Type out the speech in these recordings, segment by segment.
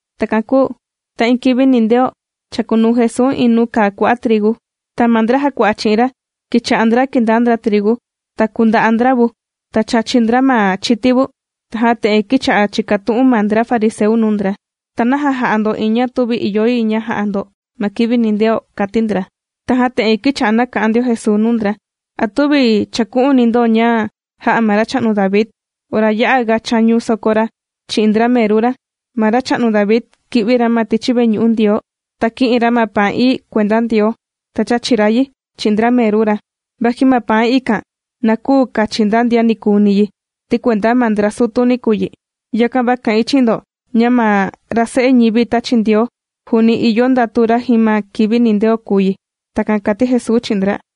Takan kūu ta iin kivi nindeo, chàkunuu Jesuu iin nuu kàa kua'a' trigu. Ta ma ndra jàkua'a chi'in ra, kīcha'a ndra kìndaa ndra trigu, ta kùnda'a ndra vu, ta chàchi ndra ma chiti vu. Tajan te'en kīcha'a chìkatu'un ma ndra fariseu nuu ndra: ―¿Ta naja jà'a ndo iin ña tüvi ìyo yi ña ja'a ndo ma kivi nindeo? ―kàti ndra. Tajan te'en kīcha'a nàka'an ndio Jesuu nuu ndra: ―¿A tüvi chàku'uni ndo ña jā'a ma racha'nu David, ora ya'aga chāñu soko ra chi'in ndra meru ra? Ma racha'nu David kī'vi ra ma tichi veñu'u Ndioo, ta kī'in ra ma paan ií kuenda Ndioo, ta chāchi ra yi chi'in ndra meru ra, vaji ma paan ikan na küu kachi nda ndian nikuuni yi, ti kuenda ma ndra sutuni kùu yi. ’Yakan va kà'in chi'in ndo ña ma ra Se'e ñivi tāchi Ndioo, juuni ìyo ndatu ra jin ma kivi nindeo kùu yi. ―Takan kàti Jesuu chi'in ndra.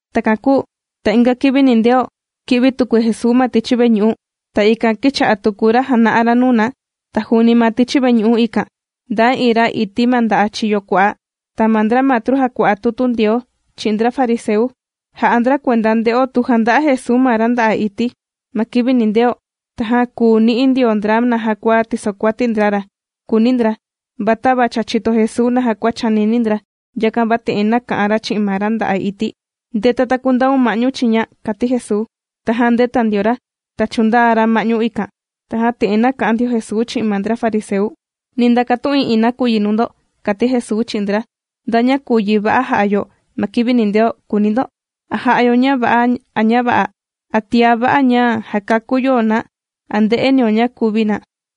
Takan kūu ta inga kivi nindeo, kī'vi tuku Jesuu ma tichi veñu'u, ta ikan kīcha'a tuku ra jàna'a ra nuu na. Ta juuni ma tichi veñu'u ikan, ndaa iin ra ití ma nda'a' chiyo kua'a. Ta ma ndra matru jàkua'a tutu Ndioo chi'in ndra fariseu, jà'a ndra kuenda nde'o tu janda'a Jesuu ma ra nda'a' ití ma kivi nindeo, tajan kùu ni'i ndio ndra naja kua tisokuati ndra ra, kùuni ndra. Va tava cha chìto Jesuu naja kua chànini ndra, yakan va te'en nāka'an ra chi'in ma ra nda'a' ití: ―Ndeta, ta kundaun ma'ñu chiña ―kàti Jesuu. Tajan ndēta ndio ra, ta chūndaa ra ma'ñu ikan. Tajan te'en nāka'an ndio Jesuu chi'in ma ndra fariseu: ―Ni ndakatu'in iin nakuyi nuu ndo ―kàti Jesuu chi'in ndra. ―¿Nda ña kùu yi va'a ja'a yo ma kivi nindeo?, kùuni ndo. ¿A jà'a yo ña va'a a ña vä'a? ¿A tiá va'a ña jàkakú yo na a ndè'e nio ña kuvi na?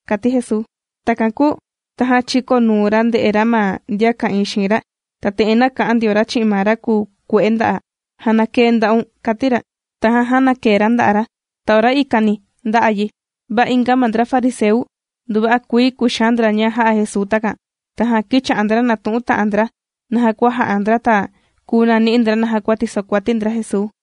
―kàti Jesuu. Takan kūu tajan chīkonuu ra nde'e ra ma ndian ka'ìin xiin ra, ta te'en nāka'an ndio ra chi'in ma ra kukue'e nda'a': ―¡Jànakee nda'un! ―kàti ra. Tajan jānakee ra nda'a' ra, ta ora ikani, ndā'a yi. Va inga ma ndra fariseu, nduva'a kuii kūxaan ndra ña jā'a Jesuu takan. Tajan kīcha'a ndra nàtu'un ta'an ndra naja kua ja'a ndra, ta kuu nani'i ndra naja kua tisokuati ndra Jesuu.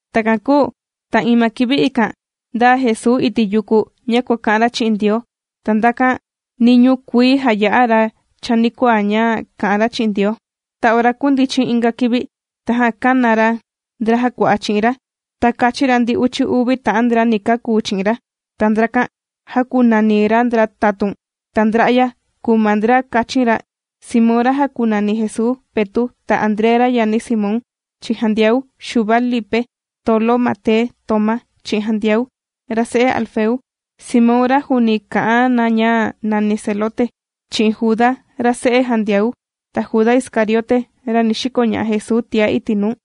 Takan kūu ta iin ma kivi ikan, ndāa Jesuu iti' yuku ña kuàka'an ra chi'in Ndioo. Ta ndakan niñuu kuii jāya'a ra chanikuaa ña kà'an ra chi'in Ndioo. Ta ora kūndichin inga kivi, tajan kāna ra, ndra jàkua'a chi'in ra, ta kāchin ra ndi uchi uvi ta'an ndra ni kakuu chi'in ra. Ta ndrakan jākunani ra ndra tatun. Ta ndra'ya kùu ma ndra kāchin ra: Simón, ra jākunani Jesuu, Petu', ta André, ra yani Simón, chi'in Jandiau, Xuva, Lipe, Tolo, Mate, Tomá, chi'in Jandiau, ra se'e Alfeu. Simón, ra juuni kà'an na ña nàni Zelote, chi'in Juda, ra se'e Jandiau, ta Juda Iscariote, ra ni xikoña'a Jesuu tiá iti' nuu.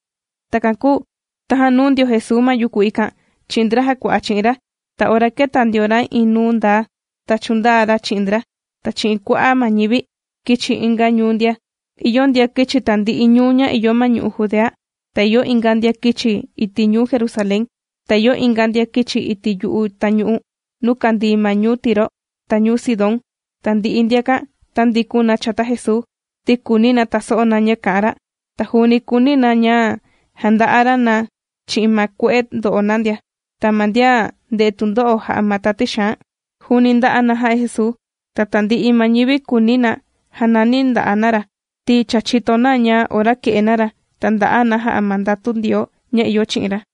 Takan kūu tajan nūu ndio Jesuu ma yuku ikan chi'in ndra jàkua'a chi'in ra. Ta ora kēta ndio ra iin nuu ndaa, ta chūndaa ra chi'in ndra, ta chi'in kua'a' ma ñivi kīchi inga ñuu ndia. Ìyo ndian kīchi tandi'i ñuu ña ìyo ma ñu'u' Judea, ta ìyo inga ndian kīchi iti' ñuu Jerusalén. Ta ìyo inga ndian kīchi iti' yu'u tañu'u nuu kàndii ma ñuu Tiro, ta ñuu Sidón. Tandi'i ndiakan tāndikun na chata Jesuu, ti kùuni na taso'o na ña kà'an ra. Ta juuni kùuni na ña na janda'a ra na chi'in ma kue'e ndo'o na ndia. Ta ma ndian ndè'e tundo'o jà'a ma tati xaan, juuni ndà'a na jà'a Jesuu. Ta tandi'i ma ñivi kùuni na janani na nda'a' na ra, ti cha chìto na ña ora kè'e na ra, ta ndà'a na jà'a ma ndatu Ndioo ña ìyo chi'in ra.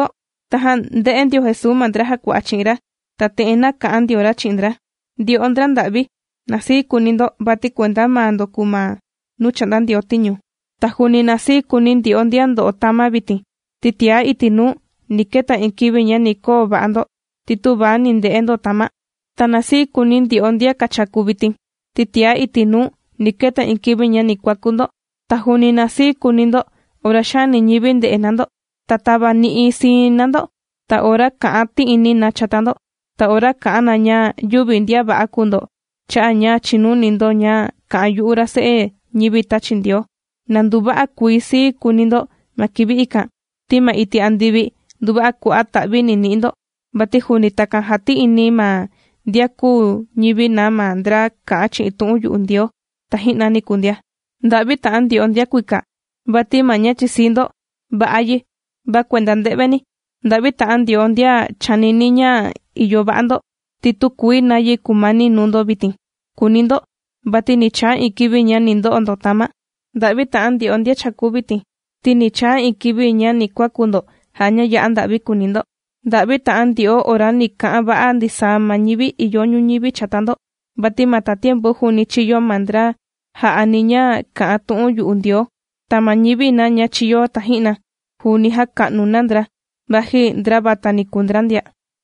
Tajan ndē'e ndio Jesuu ma ndra jàkua'a chi'in ra, ta te'en nāka'an ndio ra chi'in ndra: ―Ndyo'o ndra nda'vi, na sii kuuni ndo, vati kuenda maa ndo kùu ma nuu chà'nda Ndioo tiñu. ’Ta juuni na sii kuuni ndyo'o ndian ndo'o tama' vitin, ti tiá iti' nuu ni keta iin kivi ña ni koo va'a ndo ti tüva ni nde'e ndo tama'. ’Ta na sii kuuni ndyo'o ndian kàchaku vitin, ti tiá iti' nuu ni keta iin kivi ña ni kuakú ndo. ’Ta juuni na sii kuuni ndo ora xaani ñivi ndè'e na ndo, ta tavani'i siin na ndo, ta ora kà'an ti'ini na chata ndo, ta ora kà'an na ña yüvi ndian va'a kùu ndo, cha'a' ña chìnuni ndo ña kà'an yu'u ra Se'e ñivi tāchi Ndioo. Na nduva'a kuii sii kuuni ndo ma kivi ikan, ti ma iti' andivi nduva'a kua'a' ta'vi ni ni'i ndo, vati juuni takan jāti'ini ma ndian kūu ñivi na ma ndra kā'an chi'in tu'un yu'u Ndioo taji'na niku ndia. ’¡Nda'vi ta'an ndyo'o ndian kuika, vati ma ña chìsii ndo va'a yi, va kuenda nde'veni! ’¡Nda'vi ta'an ndyo'o ndian chànini ndo ña ìyo va'a ndo, ti tükuii nayi kumani nuu ndo vitin!, kùuni ndo. Vati ni chaa iin kivi ña ni ndo'o ndo tama'. ’¡Nda'vi ta'an ndyo'o ma vitin, ti ni chaa iin kivi ña ni kuaku ndo jà'a ña ya'a nda'vi ni kuuni ndo! ’¡Nda'vi ta'an ndyo'o ora ni ka'an va'a ndisaa ma ñivi ìyo ñuñivi chata ndo, vati ma tatiempu juuni chīyo ma ndra jā'ani ña kà'an tu'un yu'u Ndioo, ta ma ñivi na ña chīyo taji'na, juuni jāka'nu na ndra, vaji ndra vatani kūu ndra ndia!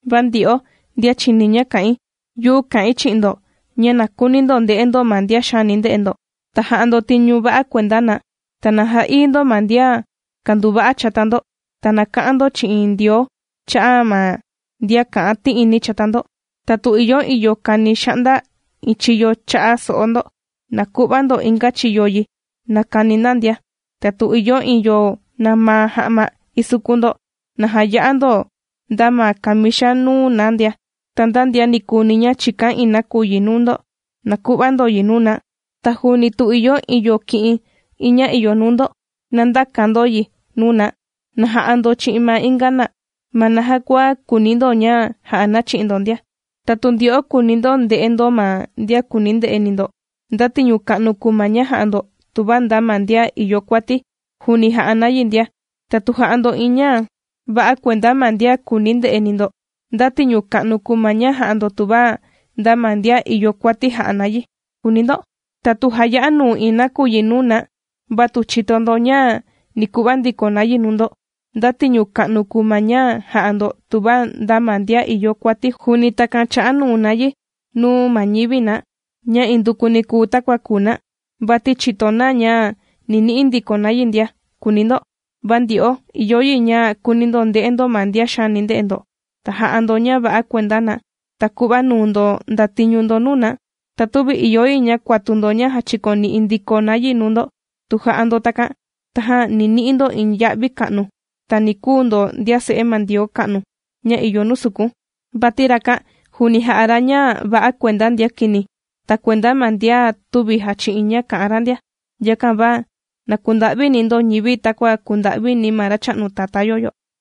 ’Va ndyo'o ndian chìni ña kà'in, yu'u kà'in chi'in ndo ña, na kuuni ndo nde'e ndo ma ndian xaani nde'e ndo, ta jà'a ndo tiñu va'a kuenda na. Ta na ja'ií ndo ma ndian kànduva'a chata ndo, ta na ka'an ndo chi'in Ndioo cha'a' ma ndian kà'an ti'ini chata ndo. Ta tu ìyo iin yo kàni xa'nda iin chiyo cha'a so'o ndo, na ku'va ndo inga chiyo yi na kani na ndia. Ta tu ìyo iin yo nàmaa ma ja'ma isukun ndo, na jaya'a ndo nda ma kamixa nuu na ndia. Ta nda ndian nikuuni ña chìkan iin nakuyi nuu ndo, na ku'va ndo yi nuu na. Ta juuni tu ìyo iin yo kì'in iin ña ìyo nuu ndo, na ndäkan ga ndo yi nuu na. Na ja'a ndo chi'in ma inga na, ma naja kua kùuni ndo ña ja'a na chi'in ndo ndia. ’Ta tu ndyo'o kùuni ndo nde'e ndo ma ndian kùuni nde'eni ndo, ¿nda tiñu ka'nu kùu ma ña jà'a ndo, tuva nda ma ndian ìyo kuati, juuni jà'a na yi ndia? Ta tu jà'a ndo iin ña va'a kuenda ma ndian kùuni nde'eni ndo, ¿nda tiñu ka'nu kùu ma ña jà'a ndo, tuva nda ma ndian ìyo kuati jà'a na yi?, kùuni ndo. Ta tu jaya'a nuu iin nakuyi nuu na va tu chìto ndo ña ni ku'va ndiko na yi nuu ndo, ¿nda tiñu ka'nu kùu ma ña jà'a ndo, tuva nda ma ndian ìyo kuati juuni takan chà'a nuu na yi nuu ma ñivi na ña indukuni kùu takua kùu na, vati chìto na ña ni ni'i ndiko na yi ndia?, kùuni ndo. Va ndyo'o ìyo yi ña kuuni ndo nde'e ndo ma ndian xaani nde'e ndo, ta jà'a ndo ña va'a kuenda na, ta ku'va nuu ndo ndatiñu ndo nuu na. Ta tüvi ìyo yi ña kuatu ndo ña jachikoni'i ndiko na yi nuu ndo. Tu jà'a ndo takan, tajan ni ni'i ndo iin ya'vi ka'nu, ta ni kuu ndo ndian se'e ma Ndioo ka'nu, ña ìyo nuu sukun. Vati rakan juuni jà'a ra ña va'a kuenda ndian kini, ta kuenda ma ndian tüvi jàchi'in ña kà'an ra ndia. Yakan va na kunda'vini ndo ñivi, takua kùnda'vini ma Racha'nu Tatá yo yo.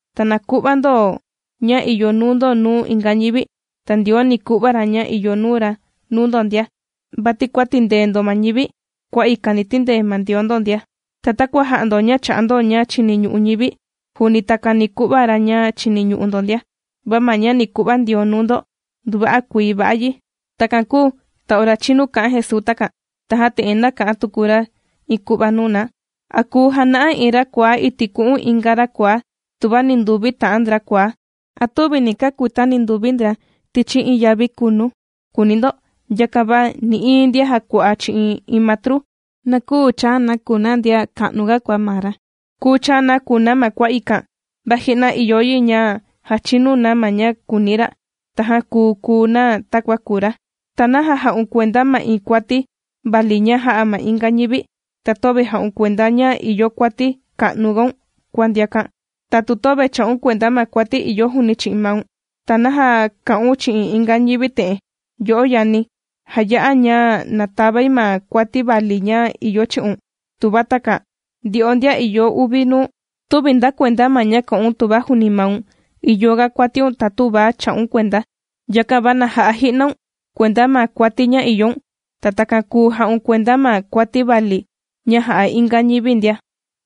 Ta na ku'va ndo ña ìyo nuu ndo nuu inga ñivi, ta Ndioo ni ku'va ra ña ìyo nuu ra nuu ndo ndia. Vati kua tìndee ndo ma ñivi, kua ikan ni tindee ma Ndioo ndo ndia. Ta takua jà'a ndo ña chà'a ndo ña chiniñu'u ñivi, juuni takan ni ku'va ra ña chiniñu'u ndo ndia. Va ma ña ni ku'va Ndioo nuu ndo nduva'a kuii va'a yi. Takan kūu ta ora chīnu kā'an Jesuu takan, tajan te'en nāka'an tuku ra iin ku'va nuu na: ―¿A kùu jana'a iin ra kuaá iti' ku'un inga ra kuaá tuva ninduvi ta'an ndra kuaá? ¿A tüvi ni kakuita ninduvi ndra tichi iin yavi kunu?, kuuni ndo. Yakan va nï'iin ndian jàkua'a chi'in iin matru, na küu chaa na kùu na ndian ka'nuga kua maa ra. Kùu chaa na kùu na ma kua ikan, va ji'na ìyo yi ña jachinu na ma ña kùuni ra, tajan kùu, kùu na takua kùu ra. ’¿Ta naja jà'un kuenda ma iin kuati vali ña jà'a ma inga ñivi, ta töve jà'un kuenda ña ìyo kuati ka'nugaun kua ndiakan? Ta tu töve chà'un kuenda ma kuati ìyo juuni chi'in maun, ¿ta naja kà'un chi'in inga ñivi te'en: “Yo'o yani, jaya'a ña na tavai ma kuati vali ña ìyo chi'un”?, tuva takan. ¡Ndyo'o ndian ìyo uvi nuu! Tüvi nda kuenda ma ña kà'un tuva juuni maun ìyoga kuatiun ta tüvi chà'un kuenda. Yakan va na ja'a ji'naun kuenda ma kuati ña ìyoun, ta takan kùu ja'un kuenda ma kuati vali ña jà'a inga ñivi ndia.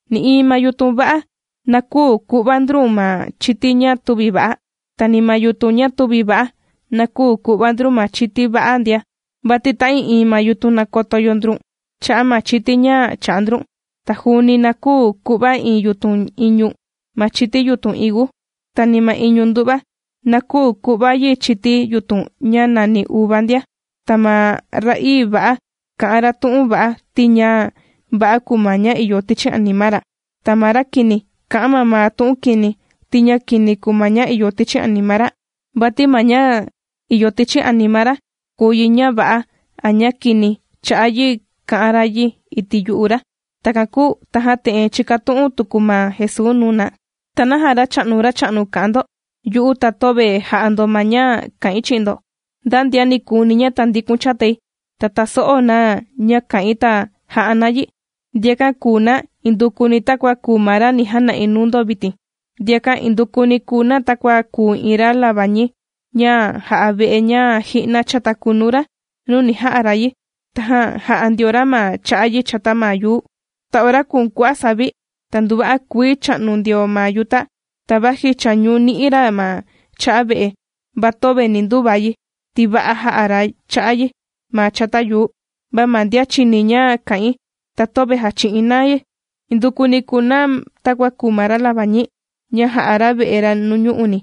’Nï'iin ma yutun va'a, na küu ku'va ndrun ma chiti ña tüvi va'a. Ta ni ma yutun ña tüvi va'a, na küu ku'va ndrun ma chiti va'a ndia. Vati ta'ii'iin ma yutun, nàkoto yo ndrun cha'a' ma chiti ña chà'a ndrun. Ta juuni na küu ku'va iin yutun iñu ma chiti yutun higu. Ta ni ma iñu ndu'va na küu ku'va yi chiti yutun ña nàni uva ndia. Ta ma ra'ii va'a, kà'an ra tu'un va'a, ti ña va'a kùu ma ña ìyo tichi anima ra. Ta ma ra kini, kà'an mamaa tu'un kini, ti ña kini kùu ma ña ìyo tichi anima ra. Vati ma ña ìyo tichi anima ra kùu yi ña va'a a ña kini chà'a yi kà'an ra yi iti' yu'u ra. Takan kūu tajan te'en chīkatu'un tuku ma Jesuu nuu na: ―¿Ta naja “Racha'nu, Racha'nu” kà'an ndo yu'u, ta töve jà'a ndo ma ña kà'in chi'in ndo? Nda ndian nikuuni ña tàndikun chatai, ta tàso'o na ña kà'in, ta jà'a na yi, ndiakan kùu na indukuni takua kùu ma ra ni jana'i nuu ndo vitin: ndiakan indukuni kùu na takua kùu iin ra labañi ña jà'a ve'e, ña ji'na chāta kunu ra nuu ni ja'a ra yi, tajan jā'a ndio ra ma cha'a yi chata ma yuu. Ta ora kūun kua'a' savi, ta nduva'a kuii chā'nu ndio ma yuta, ta vaji chàñu ni'i ra ma cha'a ve'e, va töve ni nduva yi, ti va'a jā'a ra cha'a yi ma chata yuu. Va ma ndian chìni ña kà'in, ta töve jàchi'in na yi, indukuni kùu na takua kùu ma ra labañi ña jā'a ra ve'e ra nuñu'uni,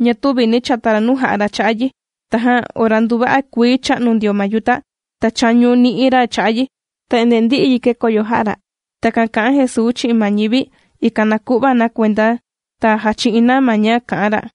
ña tüvi nī chata ra nuu jā'a ra cha'a yi. Tajan ora nduva'a kuii chā'nu ndio ma yuta, ta chāñu ni'i ra cha'a yi, ta endee ndī'i yi kèkoyo jā'a ra'. ―Takan kà'an Jesuu chi'in ma ñivi, ikan na ku'va na kuenda, ta jachi'in na ma ña kà'an ra.